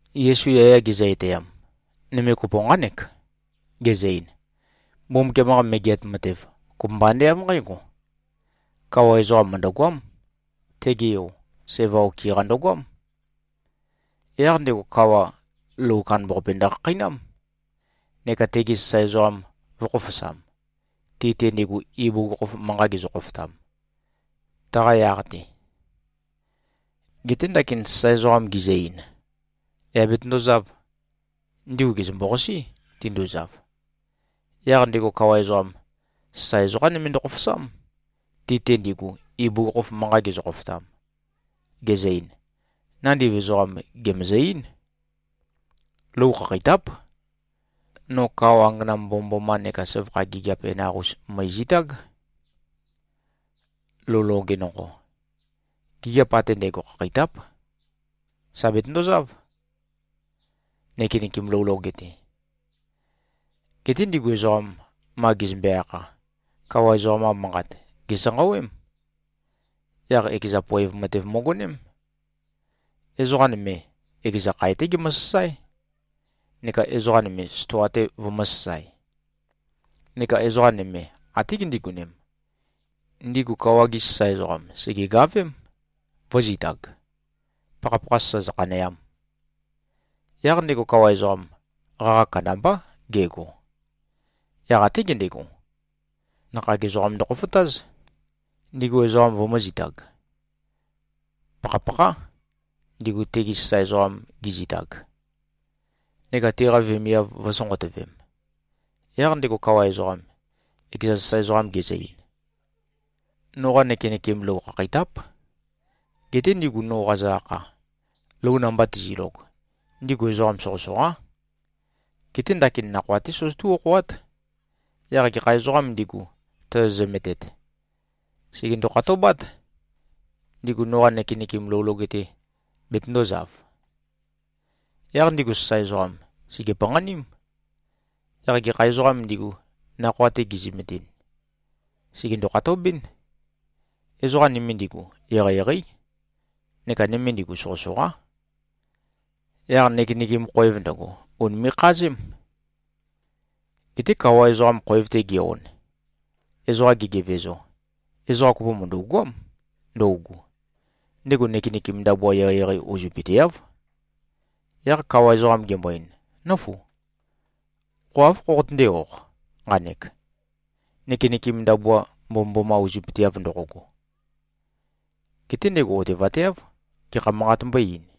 Yesu yaya gezø-etæam, nøme kopo nqánek. Gezø-ein, “Mbumbukiam-qa Megeat Matev kopømba ande av nqǽgo: Kawa ezoqam mø̀ndøgoám. Tege yo, sæva okɨ-qa ndøgoám. Yaq ndego kawa, lou kandambaqape ndøkhakheinám, neka tegi sasae ezoqam vø̄khofosam, ti-te ndigu, ibugukhokhof manqa gezø-khofotam, taqa yaq-te. Geté ndakin sasae ezoqam gizø-ein, av nqægo, yà betøndozāv, ndigu gèzømbo-qasí, tinduzav. Yaq ndego kawa ezoqam, sasae ezoqā nøme ndøkhofosám, ti-te ndigu, ibugukhokhof manqa gezø-khofotam, gezø-ein, ‘Nandiv ezoqam gèmøzø-eín. Lou khakheitáp. No kao angana mbomømboma neka søvakha gigiap enaq-us mø̀ezitág, lou loge nonqo. Gigiap ate ndægo khakheitáp. Sà betøndozáv, nøkenøkem lou loge-te.’ Geté ndigu ezoqam, ma gezømbe-akha, kawa ezoqam-qa manqat, gèsanqawém. Yaq ekeza poev matev møgoném. Ezoqa nøme, ekeza khae-té gemøsasáe, neka ezoqa nøme stoa-te vømø̄sasae. Neka ezoqa nøme até gindigonem, ndigu kawa-gi sasae ezoqam sègegavém, vø̄zitag, pakhapakha sasa zøkhaneam. Yaq ndego kawa ezoqam, qaqa kandambá gego. Yaq até gendego, nakhag ezoqam ndøkhofotáz, ndigu ezoqam vømø̄zitag, pakhapakhá, ndigu tegi sasae ezoqam gizitag, neka tiqa vemiav vø̄sonqotøvem. Yaq ndego kawa ezoqam, ekeza sasae ezoqam gezø-ein, ‘Noqa nøkenøkem lou khakheitáp. Geté ndigu, no qazø-akha, lou namba tizilog, ndigu ezoqa soqøsoqá. Geté ndakin nakhoa-té søzøtú-okhoát. Yaq gekha ezoqām ndigu, tozo-zømetet, sègendo-khatobát, ndigu noqa nøkenøkem lou loge-te betøndōzav.’ Yaq ndigu sasae ezoqam sège-panqaním. Yaq gekha ezoqām ndigu, nakhoa-te gizømetɨn, sègendo-khatobɨ́n. Ezoqa nøme ndigu, eqeieqeí, neka nøme ndigu, soqøsoqá. Yaq nøkenøkem khoev ndøgo, ùnime꞉-khazém. Geté kawa ezoqam khoev-te ge-on, ezoqa gegevezo, ezoqa kopo mø̀ndu꞉goám ndøugu. Ndego nøkenøkem ndabua eqeieqei uzøpøteáv. Yaq kawa ezoqam gembo-ein, ‘Nǿfu. Qo áv khoqotøndé-oq nqanek, nøkenøkem ndabua mbomømboma uzøpøteav ndoqogo.’ Geté ndego otevateáv, gekha manqat mbøé-eīn.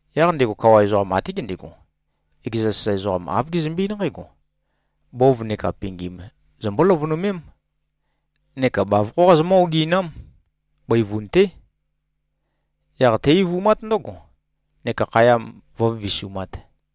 Yaq ndego kawa ezoqam até gendego, ekeza sasae ezoqam, āv gezømbe-eín nqǽgo, ‘Bov neka pingim zombó-løvønømém, neka bavokhó qazomǿ-oginám. Bøivun-té. Yaq té-eivumát ndǿgo, neka khaya vǿvivisumāt.’”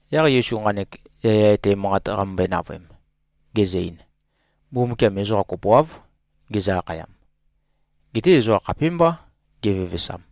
Yaq Yesu nqanek yaya etæ manqat qamømbøe-navøem, gezø-ein, “Mbumbukiam ezoqa kopoáv gezø-akhayam. Geté ezoqa khapímbá gevevesam.”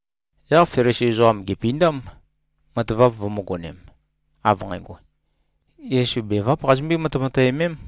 Yaq Felisi ezoqam gèpindám, matavap vømø̄gonem, av nqægo, Yesu beváp qazimbøé-matemateømém.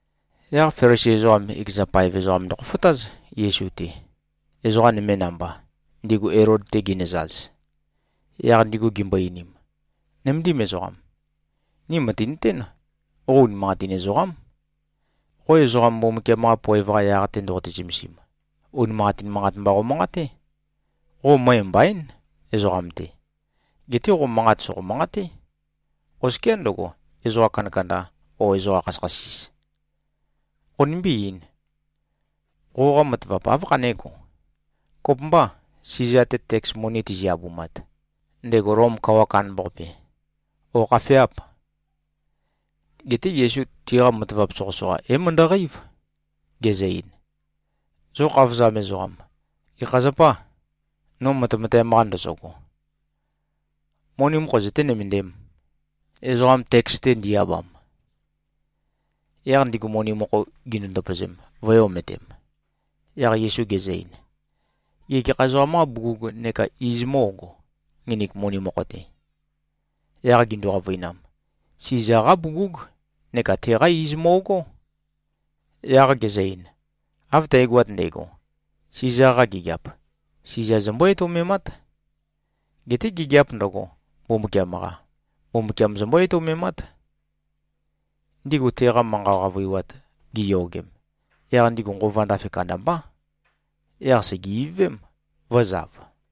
Yaq Felisi ezoqam, ekeza paev ezoqam ndøkhofotáz, Yesu-te, ezoqa nøme namba, ndigu Elod-te ginøzaz. Yaq ndigu gimbo-einim, “Nøméndim ezoqam. Ni mø̀tinøtén, qo unimanqatin ezoqám. Qo ezoqam Mbumbukiam-qa poev-qa yaq-te ndoqote-zømesim, unimanqatin manqat mba qomanqaté. Qo møe mbaín, ezoqam-te. Geté qo manqat sòqo-manqaté, oskiá ndøgo, ezoqa kandakanda o ezoqa khasøkhasis. Qonimbí-eīn. Qoqa matavap, áv khanégo? Kopømbâ, Siza-te teks moni tizi-abumat, ndego Lom kawa kandambaqape, ó, khafeâp?” Geté Yesu tiqa matavap soqøsoqa é-møndøqeív, gezø-ein, “Zo khavozam ezoqam, gekha zapâ, no matemateam-qa ndozogo? Moni mokho zøté-nømøndēm, ezoqam teks-te ndi-abam.” Yaq ndigu moni mokho gindu-ndøpøzem, vø̄e-ometem. Yaq Yesu gezø-ein, “Gê, gekha ezoqam-qâ bugug neka iz mó꞉go, nginik moni mokho-te?” Yaq gindu-qavøinam, “Siza-qá bugúg, neka teqá íz mo꞉gó.” Yaq gezø-ein, “Av tægoat ndægo, Siza-qa gigiap, Siza zombó-etoumemát. Geté gigiāp ndøgo, Mbumbukiam-qa, Mbumbukiam zombó-etoumemát.” Ndigu teqa manqa qavøiwat giyogem, yaq ndigu nqova ndafe kandambá. Yaq sège-ivøvém, vø̄zav.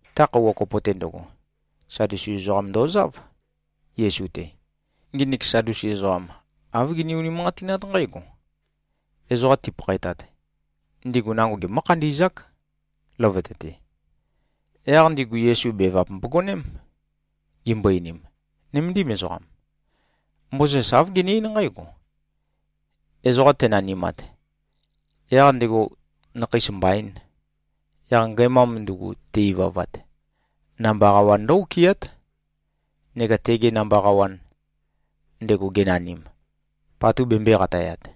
Ta khøuwa kopo-te ndøgo, Sadusi ezoqam ndozáv, Yesu-te. Nginik Sadusi ezoqam, āv gini-unimanqatinát nqǽgo: Ezoqa tipakhaetat, ndigu nango gemǿ-khandi꞉zák, løvøte-te. Yaq ndigu Yesu bevap mbogoném, gimbo-einim, “Nøméndim ezoqam. Mozes āv gene-eín nqǽgo: Ezoqa tenanimat, yaq ndego nakheis mbaīn, yaq ngæmam ndugu te-ivavat, namba qawan ndǿ-okɨát, neka tege namba qawan, ndego genanim, patu bembøē-qatayat.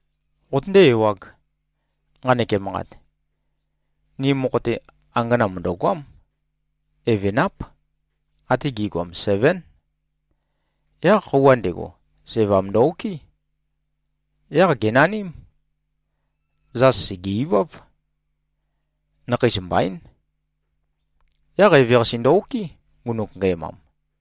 Qotøndé-ewāg, nqanek emanqat. Ni mokho-te, angana mø̀ndøgoám. Evenáp. Ate gi꞉goam sevén. Yaq khøuwa ndego, sævam ndø-okɨ́. Yaq gènaním. Zas sège-iváv. Nakheis mbaín. Yaq eveqase ndø-okɨ́, ngunuk ngæmam.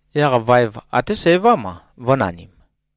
Yaq vaev até sævám-a, vø̄nanim.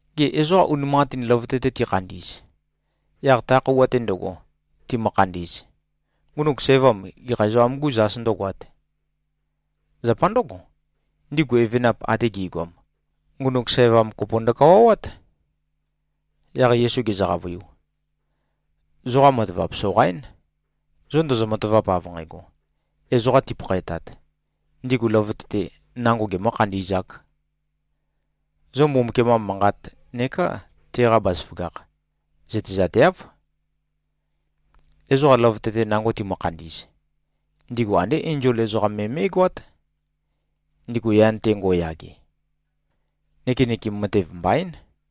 Gê, ezoqa unimanqatin løvøte-te tikhandi꞉z, yaq ta khøuwa-te ndøgo, timø-khandi꞉z, ngunuk sævam, gekha ezoqam-gû zas ndǿgoāt? Zapa ndǿgo, ndigu evenap ate gi꞉goam, ngunuk sævam kopo ndøkawawát.” Yaq Yesu gezø-qavøiu, “Zoqa matavap soqaín, zo ndozo-matavap av nqægo, ezoqa tipakhaetat, ndigu løvøte-te nango gemø̄-khandi꞉zāk. Zo Mbumbukiam-qa Manqat neká teqa bazaføgakh, zøtezateáv. Ezoqa løvøte-te nango timø-khandi꞉z, ndigu andé enzol ezoqam me mé꞉goát, ndigu yan-te ngo꞉yage. Nøkenøkem matev mbaín.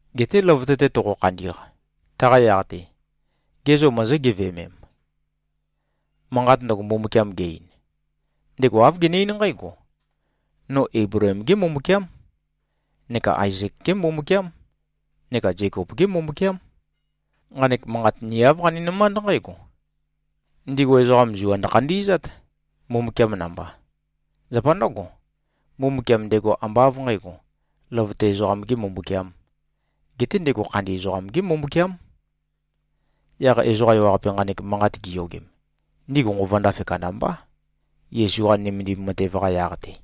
Geté løvøte-te toqo-khandi꞉q, taqa yaq-te, gê, zo mozó-geveømem, manqat ndøgo Mbumbukiam ge-ein? Ndego āv gene-eín nqǽgo, ‘No Eibleem-gé Mbumbukiám, neka Aezek-gé Mbumbukiám, neka Zekop-gé Mbumbukiám.’ Nqanek manqat ni āv qaninømánd nqǽgo: Ndigu ezoqam zua ndøkhandi꞉zát, Mbumbukiam namba. Zapa ndǿgo, Mbumbukiam ndego ambá av nqǣgo, løvøte ezoqam-gē Mbumbukiām, geté ndego khandi ezoqam-gé Mbumbukiám.” Yaq ezoqa ewaqape nqanek manqat giyogem, ndigu nqova ndafe kandambá, Yesu-qa nømendim matev-qa yaq-te.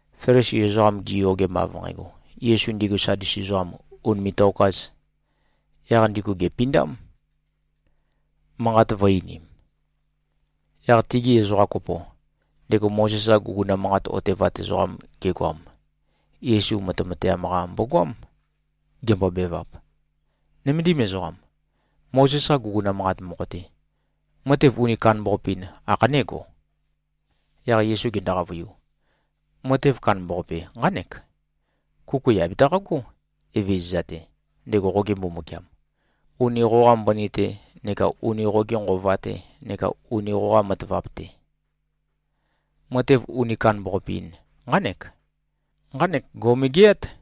Felisi ezoqam giyogem av nqægo, Yesu ndigu Sadusi ezoqam ùnime꞉-tokāz, yaq ndigu gèpindám, manqat vø̄-einim. Yaq tigi ezoqa kopo, ndego Mozes-qa guguna manqat otevat ezoqam gegoam, Yesu matemateam-qa mbogoám, gembobevap, “Nøméndim ezoqam. Mozes-qa guguna manqat mokho-te, matev uni kandambaqape-in ākhanégo?” Yaq Yesu gendo-qavøiu, “Matev kandambaqape nqánek: ‘Kuku yà betaqagó, Evezøza-te, ndego qoge Mbumbukiam, uni qoqa mbøni-te neka uni qoge nqova-te neka uni qoqa matavap-te.’ Matev uni kandambaqape-in nqánek. Nqanek gò꞉megeát.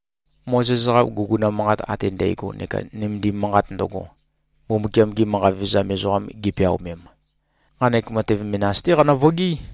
Mozes-qa guguna manqat ate ndægo neka nømendim manqat ndøgo, Mbumbukiam-gi manqa vevezam ezoqam gipeaomem, nqanek matev menas-té qanø-vøgií.”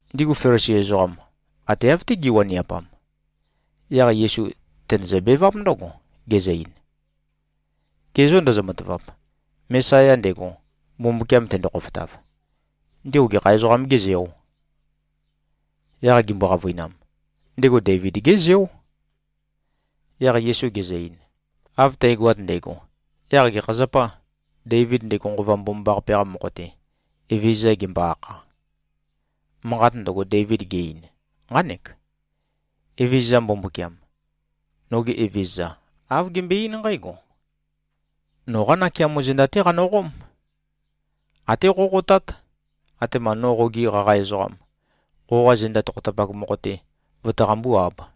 Ndigu Felisi ezoqam, ate av-té giwaniapam, yaq Yesu tenøzø-beváp ndǿgo, gezø-ein, “Gê, zo ndozo-matavap? Mesaya ndego, Mbumbukiam tendo-khofotav, ndego gekha ezoqam-gê zeò?” Yaq gimbo-qavøinam, “Ndego Deivid-gé Zeó.” Yaq Yesu gezø-ein, “Av tægoat ndægo, yaq gekha zapâ, Deivid ndego Nqova Mbomambaqape-qa mokho-te, Evezøza gembo-akha? Manqat ndøgo, Deivid ge-ein, nqánek: Evezøza Mbumbukiam, noge Evezøza, āv gembøe-eín nqǽgo, ‘Noqá nakeamo zenda-té qanøqóm. Até qóqotát, atema no qogi qaqa ezoqam, qoqa zenda tokhotapak mokho-te vøtaqambú-āb.’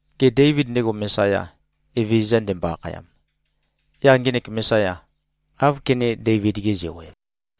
Gê, Deivid ndego Mesaya, Evezøza ndembo-akhayam, yaq ngenek Mesaya, áv kené-Deivid-ge-zeo-ev?”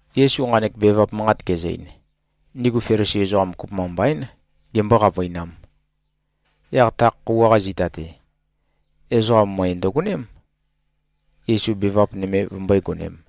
Yesu nqanek bevap manqat gezø-ein, ndigu Felisi ezoqam kopømba mbaín, gembó-qavøinām. Yaq ta khøuwa-qa zita-te, ezoqa møe ndøgoném, Yesu bevap nøme vømbøé-gonēm.